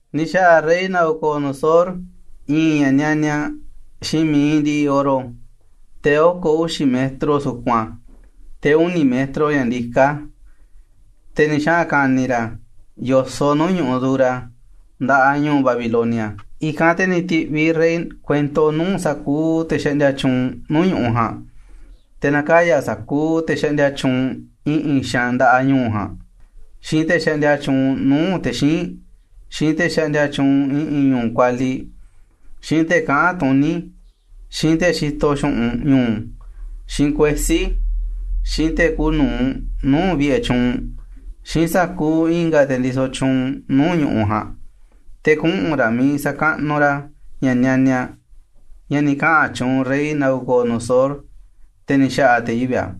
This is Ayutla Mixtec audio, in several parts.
Ni̱ xa̱ꞌa̱ rey Nabucodonosor i̱i̱n ña̱ nianiaꞌ xiinꞌ mi̱iꞌ ndiꞌiꞌ oro, te̱ oko̱ uxi̱ metro sukun a̱, te̱ uni̱ metro ña̱ ndiká a̱, te̱ ni̱ xaꞌa̱n ka̱ni̱ ra̱ a̱ yo̱soꞌ nuu̱ꞌ ñu̱ꞌuꞌ Dura, nda̱ꞌaꞌ ñu̱u̱ Babilonia. I̱kanꞌ te̱ ni̱ ti̱ꞌviꞌ rey kuento nuu̱ꞌ sa̱kuuꞌ te̱ xaꞌndia tyuunꞌ nuu̱ꞌ ñu̱ꞌuꞌ ja̱a̱nꞌ, te̱ na̱kaya̱ sa̱kuuꞌ te̱ xaꞌndia tyuunꞌ i̱ꞌi̱n xaanꞌ nda̱ꞌaꞌ ñu̱u̱ ja̱a̱nꞌ, xiinꞌ te̱ xaꞌndia tyuunꞌ nuu̱ꞌ te̱ xíinꞌ, xiinꞌ te̱ xaꞌndia tyuunꞌ i̱ꞌi̱n ñu̱u̱ kualiꞌ, xiinꞌ te̱ kaꞌán tuní, xiinꞌ te̱ xitoꞌ xu̱ꞌunꞌ ñu̱u̱, xiinꞌ kuesí, xiinꞌ te̱ kuuꞌ nu̱uꞌ nuu̱ꞌ vi̱ꞌe̱ tyuunꞌ, xiinꞌ sa̱kuuꞌ i̱nga̱ te̱ ndisoꞌ tyuunꞌ nuu̱ꞌ ñu̱ꞌuꞌ ja̱a̱nꞌ, te̱ kuꞌu̱n ra̱ miiꞌ sa̱kaꞌnuꞌ ra̱ ña̱ nianiaꞌ, ña̱ ni̱ kaꞌa̱n tyuunꞌ rey Nabucodonosor, te̱ ni̱ xa̱ꞌa̱ te̱ yivi̱ꞌ a̱.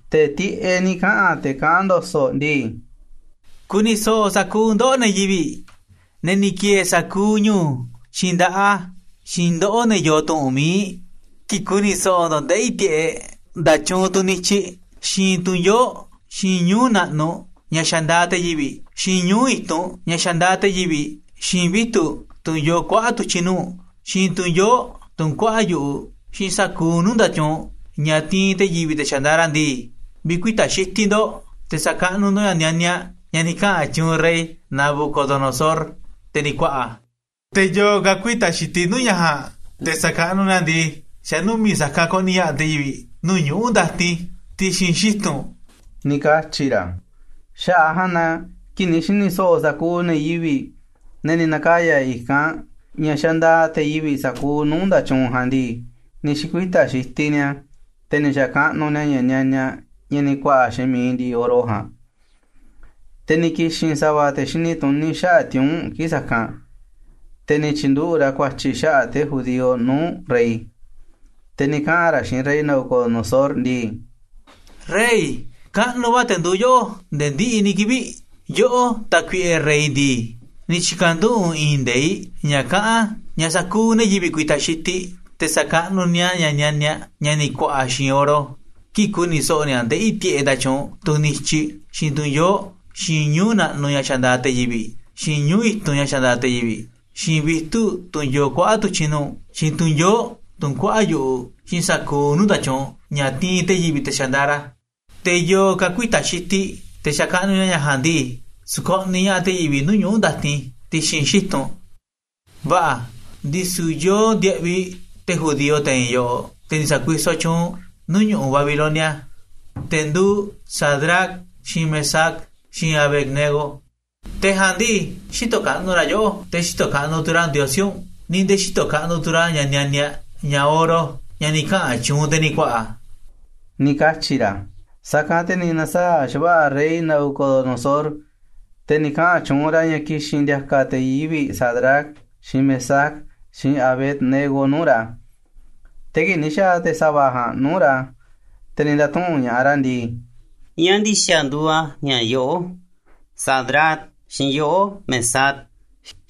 Te̱ tiꞌeꞌ ni̱ kaꞌa̱n te̱ kaꞌán ndo̱so̱ꞌ ndii: “Ku̱ni̱ so̱ꞌo̱ sa̱kuuꞌ ndoꞌó, ne̱ yivi̱ꞌ, ne̱ ni̱ ki̱e̱e̱ sa̱kuuꞌ ñu̱u̱, xiinꞌ nda̱ꞌaꞌ a̱, xiinꞌ ndoꞌó ne̱ yoo tu̱ꞌu̱n mi̱iꞌ. Kii̱ꞌ ku̱ni̱ so̱ꞌo̱ ndo̱ꞌ ndeꞌí tiꞌeꞌ nda̱tyuunꞌ tunꞌ nityiꞌ, xiinꞌ tunꞌ yoo̱ꞌ, xiinꞌ ñuu̱ꞌ naꞌnuꞌ ña̱ xandaaꞌ te̱ yivi̱ꞌ, xiinꞌ ñuu̱ꞌ i̱tunꞌ ña̱ xandaaꞌ te̱ yivi̱ꞌ, xiinꞌ vitu̱ꞌ tunꞌ yoo kuaꞌa̱ꞌ tu̱tyi̱ nuu̱ꞌ, xiinꞌ tu̱n yoo̱ꞌ, tunꞌ kuaꞌa̱ꞌ yu̱ꞌuꞌ, xiinꞌ sa̱kuuꞌ nuu̱ꞌ nda̱tyuunꞌ ña̱ tiinꞌ te̱ yivi̱ꞌ te̱ xandaaꞌ ra̱ ndii, vi̱kuita̱ xitiꞌ ndo̱ꞌ te̱ sa̱kaꞌnuꞌ ndo̱ꞌ ña̱ nianiaꞌ, ña̱ ni̱ kaꞌa̱n tyuunꞌ rey Nabucodonosor, te̱ ni̱ ku̱a̱ꞌa̱ a̱. Te̱ yo̱o̱ ka̱ ku̱ï̱ta̱ xitiꞌ nuu̱ꞌ ña̱ ja̱a̱nꞌ te̱ sa̱kaꞌnuꞌ ni̱a̱ a̱ ndii, xa̱ numi̱ꞌ sa̱kanꞌ ko̱ꞌni̱ ña̱ꞌaꞌ te̱ yivi̱ꞌ nuu̱ꞌ ñuꞌu̱ ndatin ti̱xi̱n xitu̱n”, ni̱ katyi̱ ra̱. Xaꞌa̱ꞌ a̱ ja̱a̱nꞌ na kii̱ꞌ ni̱ xi̱ni̱ so̱ꞌo̱ sa̱kuuꞌ ne̱ yivi̱ꞌ, ne̱ ni̱ na̱kaya̱ i̱kanꞌ, ña̱ xandaaꞌ te̱ yivi̱ꞌ sa̱kuuꞌ nuu̱ꞌ nda̱tyuunꞌ ja̱a̱nꞌ ndii, ni̱ xi̱kuita̱ xitiꞌ ni̱a̱, te̱ ni̱ xa̱kaꞌnuꞌ ni̱a̱ ña̱ nianiaꞌ, ña̱ ni̱ ku̱a̱ꞌa̱ xiinꞌ mi̱iꞌ ndiꞌiꞌ oro ja̱a̱nꞌ. Te̱ ni̱ ki̱xi̱n sa̱va̱ te̱ xini tuní xaꞌa̱ꞌ tiuu̱nꞌ kii̱ꞌ sa̱kanꞌ, te̱ ni̱ tyi̱nduꞌu̱ꞌ ra̱ ku̱a̱tyi̱ xaꞌa̱ꞌ te̱ judío nuu̱ꞌ rey. Te̱ ni̱ kaꞌa̱n ra̱ xiinꞌ rey Nabucodonosor ndii: ―¡Rey, kaꞌnuꞌ va̱ te̱ nduuꞌ yoꞌó nde̱e̱ ndiꞌiꞌ ni̱ kivi̱ꞌ! Yoꞌó, tákuiꞌe rey ndii, ni̱ tyi̱ka̱nduꞌu̱ꞌ u̱nꞌ i̱i̱n nde̱iꞌ ña̱ kaꞌán ña̱ sa̱kuuꞌ ne̱ yivi̱ꞌ ku̱i̱ta̱ xitiꞌ te̱ sa̱kaꞌnuꞌ ni̱a̱ ña̱ nianiaꞌ, ña̱ ni̱ ku̱a̱ꞌa̱ xiinꞌ oro, kii̱ꞌ ku̱ni̱ so̱ꞌo̱ ni̱a̱ ndeꞌí tiꞌeꞌ nda̱tyuunꞌ tunꞌ nityiꞌ, xiinꞌ tunꞌ yoo̱ꞌ, xiinꞌ ñuu̱ꞌ naꞌnuꞌ ña̱ xandaaꞌ te̱ yivi̱ꞌ, xiinꞌ ñuu̱ꞌ i̱tunꞌ ña̱ xandaaꞌ te̱ yivi̱ꞌ, xiinꞌ vitu̱ꞌ tunꞌ yoo kuaꞌa̱ꞌ tu̱tyi̱ nuu̱ꞌ, xiinꞌ tu̱n yoo̱ꞌ tunꞌ kuaꞌa̱ꞌ yu̱ꞌuꞌ, xiinꞌ sa̱kuuꞌ nuu̱ꞌ nda̱tyuunꞌ ña̱ tiinꞌ te̱ yivi̱ꞌ te̱ xandaaꞌ ra̱. Te̱ yo̱o̱ ka̱ ku̱ï̱ta̱ xitiꞌ te̱ sa̱kaꞌnuꞌ ni̱a̱ ña̱ ja̱a̱nꞌ ndii, sko̱ꞌniꞌ ña̱ꞌaꞌ te̱ yivi̱ꞌ nuu̱ꞌ ñuꞌu̱ ndatin ti̱xi̱n xitu̱n. Va̱ꞌa̱, ndisu̱ yoo ndiaꞌviꞌ te̱ judío te̱i̱n e̱ꞌ yoꞌoꞌ, te̱ ni̱ sa̱kuisoꞌ tyuunꞌ u̱nꞌ nuu̱ꞌ ñu̱ꞌuꞌ Babilonia, te̱ nduuꞌ Sadrac, xiinꞌ Mesac, xiinꞌ Abed-nego. Te̱ ja̱a̱nꞌ ndii, xïtoꞌ kaꞌnuꞌ ra̱ yoꞌó, te̱ xïtoꞌ kaꞌnuꞌ tu̱ ra̱ ndiosí u̱nꞌ, ni̱ nde̱e̱ xïtoꞌ kaꞌnuꞌ tu̱ ra̱ ña̱ nianiaꞌ, ña̱ oro, ña̱ ni̱ kaꞌa̱n tyuunꞌ u̱nꞌ te̱ ni̱ ku̱a̱ꞌa̱ ―ni̱ katyi̱ ra̱. Sa̱kanꞌ te̱ ni̱ na̱saa̱ꞌ xa̱va̱ꞌa̱ rey Nabucodonosor, te̱ ni̱ kaꞌa̱n tyuunꞌ ra̱ ña̱ ki̱xi̱n ndi̱a̱ka̱ te̱ yivi̱ꞌ Sadrac, xiinꞌ Mesac, xiinꞌ Abed-nego nuu̱ꞌ ra̱. Te̱ kii̱ꞌ ni̱ xa̱a̱ te̱ sa̱va̱ ja̱a̱nꞌ nuu̱ꞌ ra̱, te̱ ni̱ nda̱tuꞌu̱nꞌ ña̱ꞌaꞌ ra̱ ndii: ―¿Ñáá ndi̱xa̱ nduuꞌ a̱ ña̱ yoꞌó, Sadrac, xiinꞌ yoꞌó, Mesac,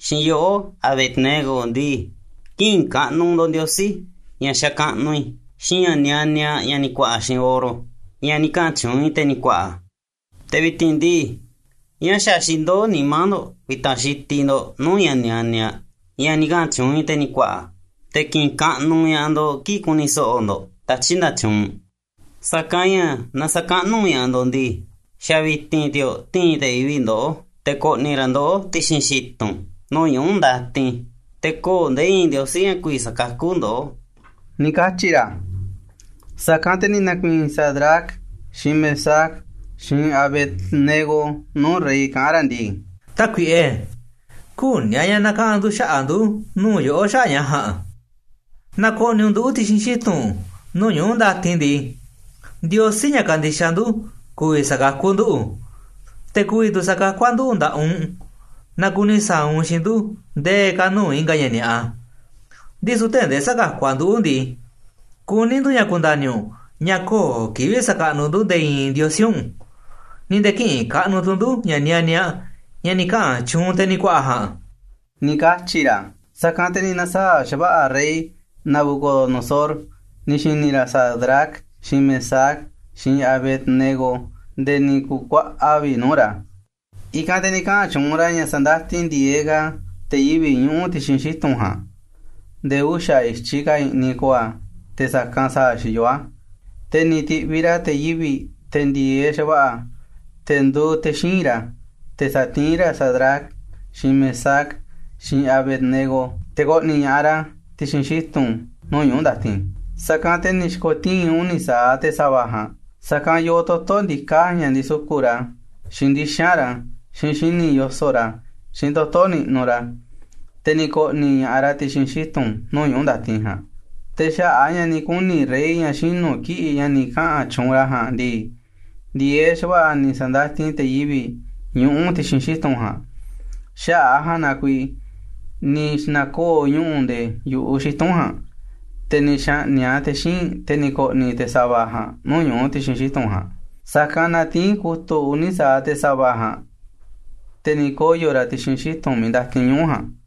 xiinꞌ yoꞌó, Abed-nego ndii, kï̱ꞌi̱n kaꞌnuꞌ ndo̱ꞌ ndiosí, ña̱ xakaꞌnuꞌ i̱, xiinꞌ ña̱ nianiaꞌ, ña̱ ni̱ ku̱a̱ꞌa̱ xiinꞌ oro, ña̱ ni̱ kaꞌa̱n tyuunꞌ i̱, te̱ ni̱ ku̱a̱ꞌa̱? Te̱ vi̱ti̱n ndii, ¿ñáá xa̱ xindoó nimá ndo̱ꞌ ku̱i̱ta̱ xitiꞌ ndo̱ꞌ nuu̱ꞌ ña̱ nianiaꞌ, ña̱ ni̱ kaꞌa̱n tyuunꞌ i̱ te̱ ni̱ ku̱a̱ꞌa̱ a̱, te̱ ki̱ꞌi̱n kaꞌnuꞌ ña̱ꞌaꞌ ndo̱ꞌ kii̱ꞌ ku̱ni̱ so̱ꞌo̱ ndo̱ꞌ tatyi̱ꞌ nda̱tyuunꞌ? Sa̱kanꞌ ña̱ naaꞌ sä̱kaꞌnuꞌ ña̱ꞌaꞌ ndo̱ꞌ ndii, xa̱ vi̱ti̱n ti̱o̱ꞌ ti̱i̱n te̱ yivi̱ꞌ ndoꞌó te̱ ko̱ꞌni̱ ra̱ ndoꞌó ti̱xi̱n xitu̱n nuu̱ꞌ ñuꞌu̱ ndatin, te̱ kö̱o̱ nde̱e̱ i̱i̱n ndiosí ña̱ ku̱vi̱ sa̱kakú ndoꞌó ―ni̱ katyi̱ ra̱. Sa̱kanꞌ te̱ ni̱ na̱ku̱i̱i̱n Sadrac, xiinꞌ Mesac, xiinꞌ Abed-nego nuu̱ꞌ rey kaꞌán ra̱ ndii: ―Tákuiꞌe, küní a̱ ña̱ na̱kaꞌa̱n ndu̱ xaꞌa̱ꞌ ndu̱ nuu̱ꞌ yoꞌó xaꞌa̱ꞌ ña̱ ja̱a̱nꞌ. Naaꞌ ko̱ꞌni̱ u̱nꞌ nduꞌu̱ ti̱xi̱n xitu̱n nuu̱ꞌ ñuꞌu̱ ndatin ndii, Ndiosí, ña̱ kandixaꞌ ndu̱, ku̱vi̱ sa̱kakú nduꞌu̱, te̱ ku̱vi̱ tu̱ sa̱kakú a̱ nduꞌu̱ nda̱ꞌaꞌ u̱nꞌ naaꞌ kuni sa̱a̱ u̱nꞌ xiinꞌ ndu̱ nde̱e̱ ka̱ nuu̱ꞌ i̱nga̱ ña̱ ni̱a̱ꞌa. Ndisu̱ tee̱ꞌ ndee sä̱kakú a̱ nduꞌu̱ ndii, kuní ndu̱ ña̱ ku̱nda̱ni̱ u̱nꞌ ña̱ kö̱o̱ kivi̱ꞌ sa̱kaꞌnuꞌ ndu̱ nde̱e̱ i̱i̱n ndiosí u̱nꞌ, ni̱ nde̱e̱ kï̱ꞌi̱n kaꞌnuꞌ tu̱ ndu̱ ña̱ nianiaꞌ, ña̱ ni̱ kaꞌa̱n tyuunꞌ u̱nꞌ te̱ ni̱ ku̱a̱ꞌa̱ ja̱a̱nꞌ ―ni̱ katyi̱ ra̱. Sa̱kanꞌ te̱ ni̱ na̱saa̱ꞌ xa̱va̱ꞌa̱ rey Nabucodonosor ni̱ xi̱ni̱ ra̱ Sadrac, xiinꞌ Mesac, xiinꞌ Abed-nego nde̱e̱ ni̱ ku̱kuaꞌa vi̱ꞌ nuu̱ꞌ ra̱. I̱kanꞌ te̱ ni̱ kaꞌa̱n tyuunꞌ ra̱ ña̱ sa̱ndatin ndi̱e̱eꞌ ka̱ te̱ yivi̱ꞌ ñuꞌu̱ ti̱xi̱n xitu̱n ja̱a̱nꞌ nde̱e̱ uxa̱ i̱tyiꞌ ka̱ i̱ꞌni̱ ko̱o̱ a̱ te̱ sa̱kanꞌ sa̱a̱ xiyoó a̱. Te̱ ni̱ ti̱ꞌviꞌ ra̱ te̱ yivi̱ꞌ, te̱ ndi̱e̱eꞌ xa̱va̱ꞌa̱, te̱ nduuꞌ te̱ xíinꞌ ra̱, te̱ sa̱tiín ra̱ Sadrac, xiinꞌ Mesac, xiinꞌ Abed-nego te̱ ko̱ꞌni̱ ña̱ꞌaꞌ ra̱ ti̱xi̱n xitu̱n nuu̱ꞌ ñuꞌu̱ ndatin. Sa̱kanꞌ te̱ ni̱ xi̱ko̱tii̱n uni̱ sa̱aꞌ te̱ sa̱va̱ ja̱a̱nꞌ, sa̱kanꞌ yoo toto̱ ndiká ña̱ ndisuku̱ꞌ ra̱, xiinꞌ ndixa̱nꞌ ra̱, xiinꞌ xini̱ꞌ yoso̱ꞌ ra̱, xiinꞌ toto̱ niꞌnuꞌ ra̱, te̱ ni̱ ko̱ꞌni̱ ña̱ꞌaꞌ ra̱ ti̱xi̱n xitu̱n nuu̱ꞌ ñuꞌu̱ ndatin ja̱a̱nꞌ. Te̱ xaꞌa̱ꞌ a̱ ña̱ ni̱ kuni̱ rey ña̱ xinu̱ kiꞌi̱ꞌ ña̱ ni̱ kaꞌa̱n tyuunꞌ ra̱ ja̱a̱nꞌ ndii, ndi̱e̱eꞌ xa̱va̱ꞌa̱ ni̱ sa̱ndatin te̱ yivi̱ꞌ ñuꞌu̱ ti̱xi̱n xitu̱n ja̱a̱nꞌ. Xaꞌa̱ꞌ a̱ ja̱a̱nꞌ na kuiiꞌ ni̱ xna̱koo̱ ñuꞌu̱ nde̱e̱ yu̱ꞌuꞌ xitu̱n ja̱a̱nꞌ, te̱ ni̱ xa̱ꞌni̱ꞌ a̱ te̱ xíinꞌ, te̱ ni̱ ko̱ꞌni̱ te̱ sa̱va̱ ja̱a̱nꞌ nuu̱ꞌ ñuꞌu̱ ti̱xi̱n xitu̱n ja̱a̱nꞌ. Sa̱kanꞌ na tiín kutu̱ꞌ uni̱ sa̱aꞌ te̱ sa̱va̱ ja̱a̱nꞌ, te̱ ni̱ koyo̱ ra̱ ti̱xi̱n xitu̱n miiꞌ ndatin ñuꞌu̱ ja̱a̱nꞌ.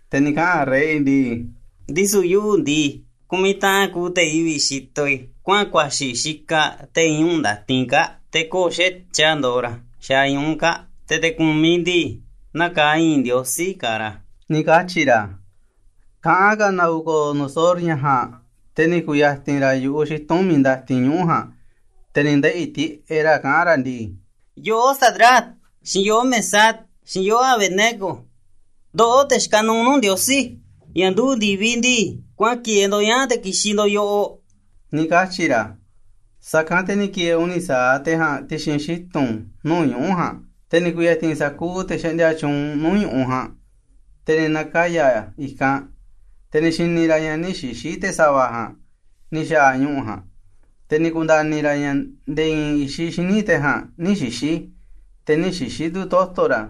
Te̱ ni̱ kaꞌa̱n rey ndii: ―Ndisu̱ yuꞌu̱ ndii, ku̱miꞌ taꞌan kuuꞌ te̱ yivi̱ꞌ xitoꞌ i̱ kuaꞌa̱n kuaxi̱ xikaꞌ te̱i̱n ñuꞌu̱ ndatin kaa̱ꞌ, te̱ kö̱o̱ xa̱tyiꞌ a̱ ndoꞌoꞌ ra̱ xaaꞌ ñuꞌu̱ kaa̱ꞌ, te̱ te̱ ku̱miꞌ ndii, naa kaaꞌ i̱i̱n ndiosí kaaꞌ ra̱ ―ni̱ katyi̱ ra̱. Kaꞌán ka̱ Nabucodonosor ña̱ ja̱a̱nꞌ, te̱ ni̱ ku̱ya̱ti̱n ra̱ yu̱ꞌuꞌ xitu̱n miiꞌ ndatin ñuꞌu̱ ja̱a̱nꞌ, te̱ ni̱ ndeꞌi̱ tiꞌeꞌ ra̱ kaꞌán ra̱ ndii: ―Yoꞌó, Sadrac, xiinꞌ yoꞌó, Mesac, xiinꞌ yoꞌó, Abed-nego. Ndoꞌó, te̱ xikaꞌ nuuꞌ nuu̱ꞌ Ndiosí, ña̱ nduꞌu̱ꞌ ndi̱viꞌ ndii, kuaꞌa̱n ki̱e̱e̱ ndo̱ꞌ ñaa̱ꞌ te̱ ki̱xi̱n ndo̱ꞌ yoꞌoꞌ ―ni̱ katyi̱ ra̱. Sa̱kanꞌ te̱ ni̱ ki̱e̱e̱ uni̱ sa̱aꞌ te̱ ja̱a̱nꞌ ti̱xi̱n xitu̱n nuu̱ꞌ ñuꞌu̱ ja̱a̱nꞌ. Te̱ ni̱ ku̱ya̱ti̱n sa̱kuuꞌ te̱ xaꞌndia tyuunꞌ nuu̱ꞌ ñu̱ꞌuꞌ ja̱a̱nꞌ, te̱ ni̱ na̱kaya̱ i̱kanꞌ, te̱ ni̱ xi̱ni̱ ra̱ ña̱ nï̱ xixi̱ te̱ sa̱va̱ ja̱a̱nꞌ ni̱ xa̱a̱ ñuꞌu̱ ja̱a̱nꞌ, te̱ ni̱ ku̱nda̱ni̱ ra̱ ña̱ nde̱e̱ i̱i̱n i̱xiꞌ xíniꞌ te̱ ja̱a̱nꞌ nï̱ xixi̱. Te̱ nï̱ xixi̱ tu̱ toto̱ ra̱,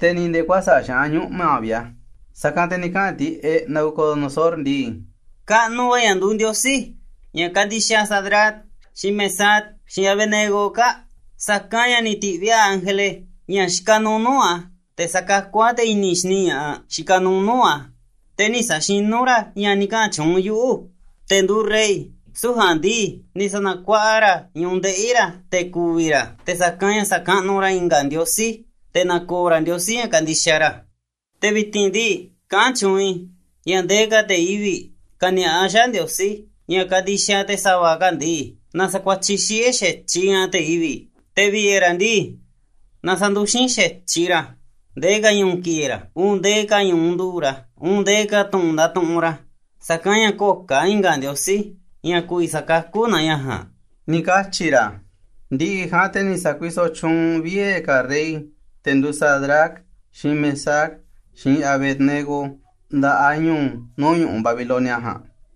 te̱ ni̱ nde̱e̱ kuäsa̱ꞌ xaꞌán ñuꞌma̱ vi̱ꞌ a̱. Sa̱kanꞌ te̱ ni̱ kaꞌa̱n tiꞌeꞌ Nabucodonosor ndii: ―¡Kaꞌnuꞌ va̱ ña̱ nduuꞌ Ndiosí, ña̱ kandixaꞌ Sadrac, xiinꞌ Mesac, xiinꞌ Abed-nego kaa̱ꞌ, sa̱kanꞌ ña̱ ni̱ ti̱ꞌviꞌ a̱ ángele, ña̱ xikaꞌ nuuꞌ nuu̱ꞌ a̱, te̱ sa̱kakú a̱ te̱ i̱ni̱ xini ña̱ꞌaꞌ xikaꞌ nuuꞌ nuu̱ꞌ a̱, te̱ nï̱ sa̱xinú ra̱ ña̱ ni̱ kaꞌa̱n tyuunꞌ yuꞌu̱, te̱ nduuꞌ rey! Süu̱ꞌ ja̱a̱nꞌ ndii, ni̱ sa̱na̱kuaꞌa ra̱ ñu̱ꞌuꞌ ndeꞌi̱ ra̱ te̱ ku̱vi̱ ra̱ te̱ sa̱kanꞌ ña̱ sa̱kaꞌnuꞌ ra̱ i̱nga̱ ndiosí, te̱ na̱ko̱o̱ ra̱ Ndiosí, ña̱ kandixaꞌ ra̱. Te̱ vi̱ti̱n ndii, kaꞌán tyuunꞌ i̱ ña̱ ndee ka̱ te̱ yivi̱ꞌ ka̱ni̱a̱ꞌa xaꞌa̱ꞌ Ndiosí, ña̱ kandixaꞌ te̱ sa̱va̱ kaa̱ꞌ ndii, na sa̱kuatyiꞌ xiꞌe̱ xa̱tyiꞌ ña̱ꞌaꞌ te̱ yivi̱ꞌ, te̱ vi̱ꞌe̱ ra̱ ndii, na sa̱nduxín xa̱tyiꞌ ra̱ a̱, ndee ka̱ ñu̱u̱ ki̱e̱e̱ ra̱, uun ndee ka̱ ñu̱ꞌuꞌ nduꞌu̱ꞌ ra̱, uun ndee ka̱ tu̱ꞌu̱n ndatuꞌunꞌ ra̱, sa̱kanꞌ ña̱ kö̱o̱ ka̱ i̱nga̱ Ndiosí, ña̱ ku̱vi̱ sakakú naa ña̱ ja̱a̱nꞌ ―ni̱ katyi̱ ra̱. Ndi̱ꞌi̱ ja̱a̱nꞌ te̱ ni̱ sa̱kuisoꞌ tyuunꞌ vie̱ ka̱ rey te̱ nduuꞌ Sadrac, xiinꞌ Mesac, xiinꞌ Abed-nego nda̱ꞌaꞌ ñu̱u̱ nuu̱ꞌ ñu̱ꞌuꞌ Babilonia ja̱a̱nꞌ.